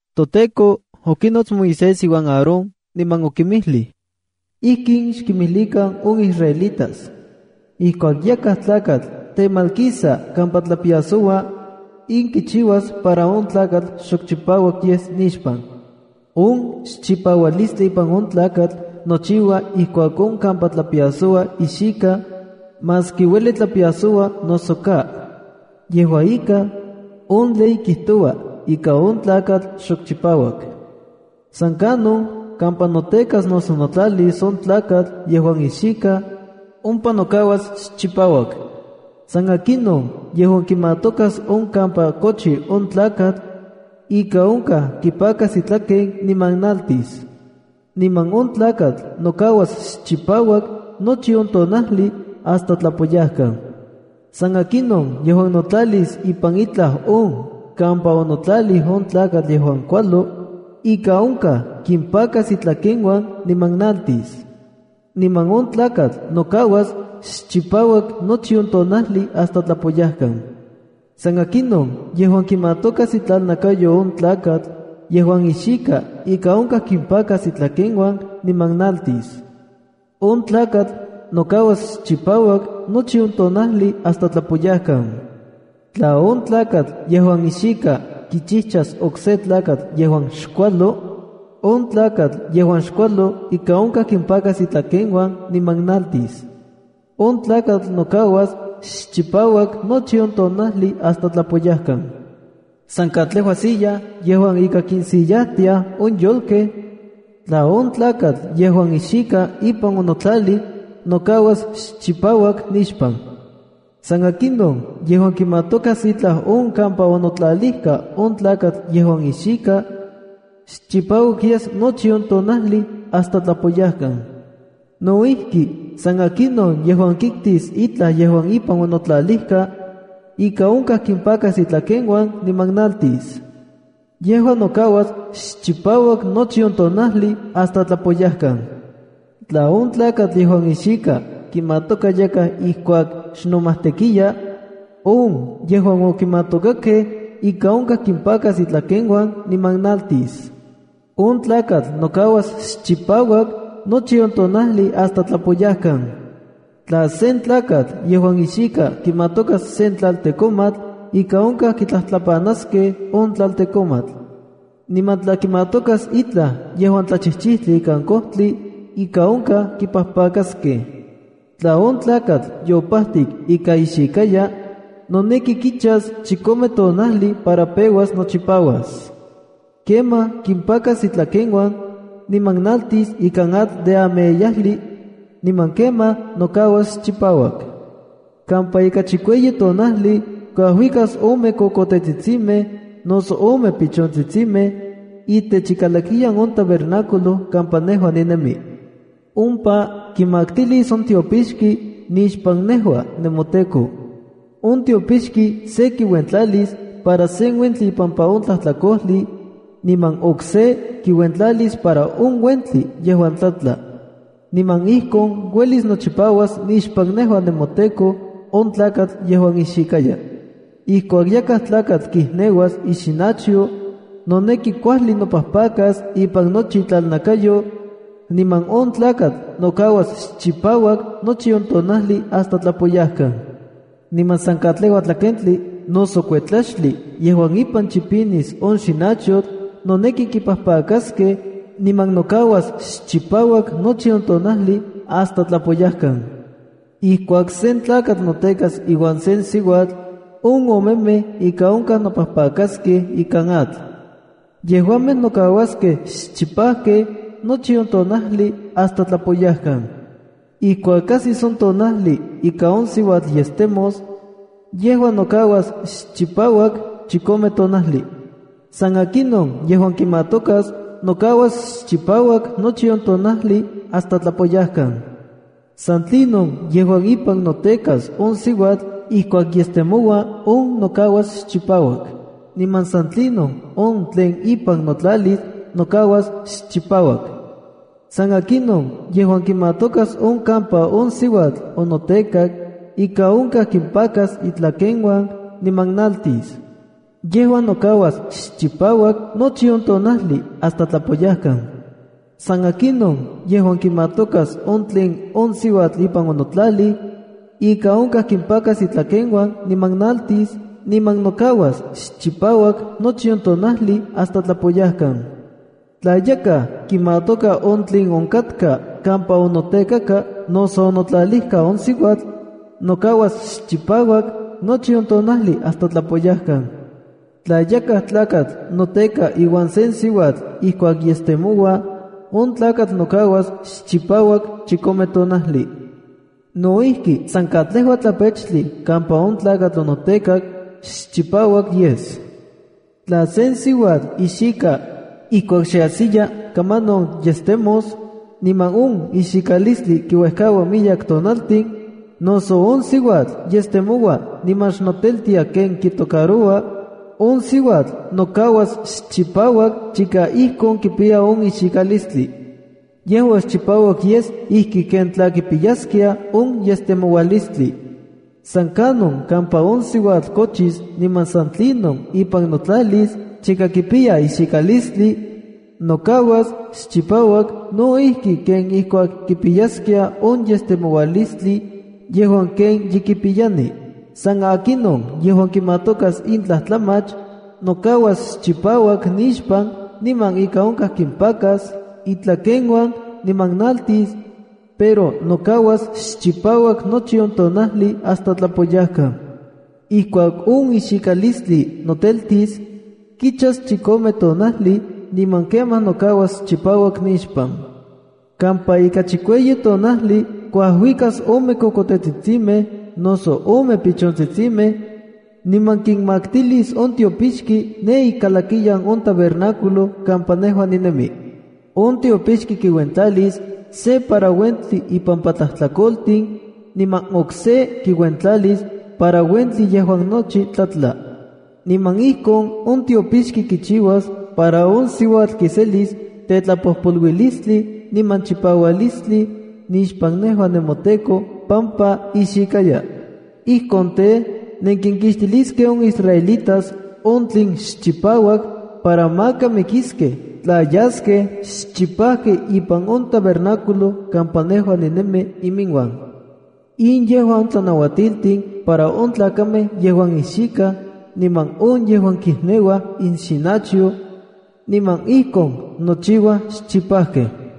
ToTEKO okinots Moisés iuan Aarón, niman okinmijlij: “Ijkin xkimijlikan on israelitas: Ijkuak yakaj tlakatl temalkisa kampa tlapiasoua, in kichiuas para on tlakatl xok chipauak yes nixpan. On xchipaualistli ipan on tlakatl nochiua ijkuak on kampa tlapiasoua ixika, maski ueli tlapiasoua noso ka. Yejua ika, on ley kijtoua ika on tlakatl xchipauak. ’San kanon kampa notekas noso notlalis on tlakatl yejuan ixika, ompa nokauas xchipauak. ’San akinon yejuan kimatokas on kampa kochi on tlakatl, ika onkaj kipakas itlaken niman naltis. Niman on tlakatl nokauas xchipauak nochi on tonajli hasta tlapoyajkan. ’San akinon yejuan notlalis ipan itlaj on kampa onotlalij on tlakatl yejuan kualo, ika onkaj kimpakas itlakeuan niman naltis. Niman on tlakatl nokauas xchipauak nochi on tonajli hasta tlapoyajkan. ’San akinon yejuan kimatokas itlalnakayo on tlakatl yejuan ixika ika onkaj kimpakas itlakeuan niman naltis. On tlakatl nokauas xchipauak nochi on tonajli hasta tlapoyajkan. ’Tla on tlakatl yejuan ixika kichijchas okse tlakatl yejuan xkualo, on tlakatl yejuan xkualo ika onkaj kimpakas itlakeuan niman naltis. On tlakatl nokauas xchipauak nochi on tonajli hasta tlapoyajkan. ’San katlejua silla yejuan ika kinsillajtiaj on yolkej, tla on tlakatl yejuan ixika ipan onotlalij, nokauas xchipauak nixpan. ’San akinon yejuan kimatokas itlaj on kampa onotlalijka on tlakatl yejuan ixika, xchipauak yes nochi on tonajli hasta tlapoyajkan. ’No ijki, san akinon yejuan kiktis itlaj yejuan ipan onotlalijka, ika onkaj kimpakas itlakeuan niman naltis. Yejua nokauas xchipauak nochi on tonajli hasta tlapoyajkan. ’Tla on tlakatl yejuan ixika kimatoka yakaj ijkuak xnomajtekia, on yejuan okimatokakej ika onkaj kimpakas itlakeuan niman naltis. On tlakatl nokauas xchipauak nochi on tonajli hasta tlapoyajkan. ’Tla sen tlakatl yejuan ixika kimatokas sen tlaltekomatl, ika onkaj kitlajtlapanaskej on tlaltekomatl. Niman tla kimatokas itlaj yejuan tlachijchijtli ikan kojtli, ika onkaj kipajpakaskej. ’Tla on tlakatl yopajtik ika ixikaya, noneki kichas chikome tonajli para peuas nochipauas. Kemaj kimpakas itlakeuan, niman naltis ikan atl de ameyajli, niman kemaj nokauas chipauak. Kampa ika chikueyi tonajli kuajuikas ome kokotetsitsimej noso ome pichontsitsimej, itech ikalakiyan on tabernáculo kampa nejua ninemi. Ompa kimaktilis on tiopixki nixpan nejua nemoTEKO. On tiopixki se kiuentlalis para sen uentli ipampa on tlajtlakojli, niman okse kiuentlalis para on uentli yejuan tlatla. Niman ijkon uelis nochipauas nixpan nejua nemoTEKO on tlakatl yejuan ixikaya. ’Ijkuak yakaj tlakatl kijneuas ixinachyo, noneki kuajli nopajpakas ipan nochi itlalnakayo, niman on tlakatl nokauas xchipauak nochi on tonajli hasta tlapoyajkan. ’Niman san katlejua tlakentli noso kuetlaxtli yejuan ipan chipinis on xinachyotl, noneki kipajpakaskej, niman nokauas xchipauak nochi on tonajli hasta tlapoyajkan. ’Ijkuak sen tlakatl notekas iuan sen siuatl, on omemej ika onkaj nopajpakaskej ikan atl. Yejuamej nokauaskej xchipajkej nochi on tonajli hasta tlapoyajkan. ’Ijkuak ajsis on tonajli ika on siuatl yestemos, yejua nokauas xchipauak chikome tonajli. “San akinon yejuan kimatokas, nokauas xchipauak nochi on tonajli hasta tlapoyajkan. ’San tlinon yejuan ipan notekas on siuatl ijkuak yestemoua, on nokauas xchipauak, niman san tlinon on tlen ipan notlalis nokauas xchipauak. ’San akinon yejuan kimatokas on kampa on siuatl onotekak ika onkaj kimpakas itlakeuan niman naltis. Yejua nokauas xchipauak nochi on tonajli hasta tlapoyajkan. ’San akinon yejuan kimatokas on tlen on siuatl ipan onotlalij, ika onkaj kimpakas itlakeuan niman naltis niman nokauas xchipauak nochi on tonajli hasta tlapoyajkan. Tla yakaj kimatoka on tlen onkatka kampa onotekaka noso onotlalijka on siuatl, nokauas xchipauak nochi on tonajli hasta tlapoyajkan. ’Tla yakaj tlakatl noteka iuan sen siuatl ijkuak yestemoua, on tlakatl nokauas xchipauak chikome tonajli. No ijki, san katlejua tlapechtli kampa on tlakatl onotekak xchipauak yes. ’Tla sen siuatl ixika ijkuak xe ajsiya kamanon yestemos, niman on ixikalistli kiuejkaua miyek tonaltin, noso on siuatl yestemoua niman xnoteltia ken kitocaroua, on siuatl nokauas xchipauak chika ijkon kipiya on ixikalistli. Yejua xchipauak yes ijki ken tla kipiyaskia on yestemoualistli. ’San kanon kampa on siuatl kochis niman san tlinon ipan notlalis chika kipiya ixikalistli, nokauas xchipauak, no ijki ken ijkuak kipiyaskia on yestemoualistli yejuan ken ye kipiyani. “San akinon yejuan kimatokas in tlajtlamach, nokauas xchipauak nixpan niman ika onkaj kimpakas itlakeuan niman naltis, pero nokauas xchipauak nochi on tonajli hasta tlapoyajkan. ’Ijkuak on ixikalistli noteltis, kichas chikome tonajli, niman kemaj nokauas chipauak nixpan. Kampa ika chikueyi tonajli kuajuikas ome kokotetsitsimej noso ome pichontsitsimej, niman kinmaktilis on tiopixki ne ikalakiyan on tabernáculo kampa nejua ninemi. On tiopixki kiuentlalis se para uentli ipampa tlajtlakotin, niman okse kiuentlalis para uentli yejuan nochi tlatla. Niman ijkon on tiopixki kichiuas para on siuatl kiselis tetlapojpoluilistli niman chipaualistli nixpan nejua nemoTEKO pampa ixikaya. Ijkon tej, nenkinkixtiliskej on israelitas on tlen xchipauak para maka mikiskej tla yaskej xchipajkej ipan on tabernáculo kampa nejua ninemi iminuan.” In yejua on tlanauatiltin para on tlakamej yejuan ixikaj niman on yejuan kijneuaj inxinachyo, niman ijkon nochiuaj xchipajkej.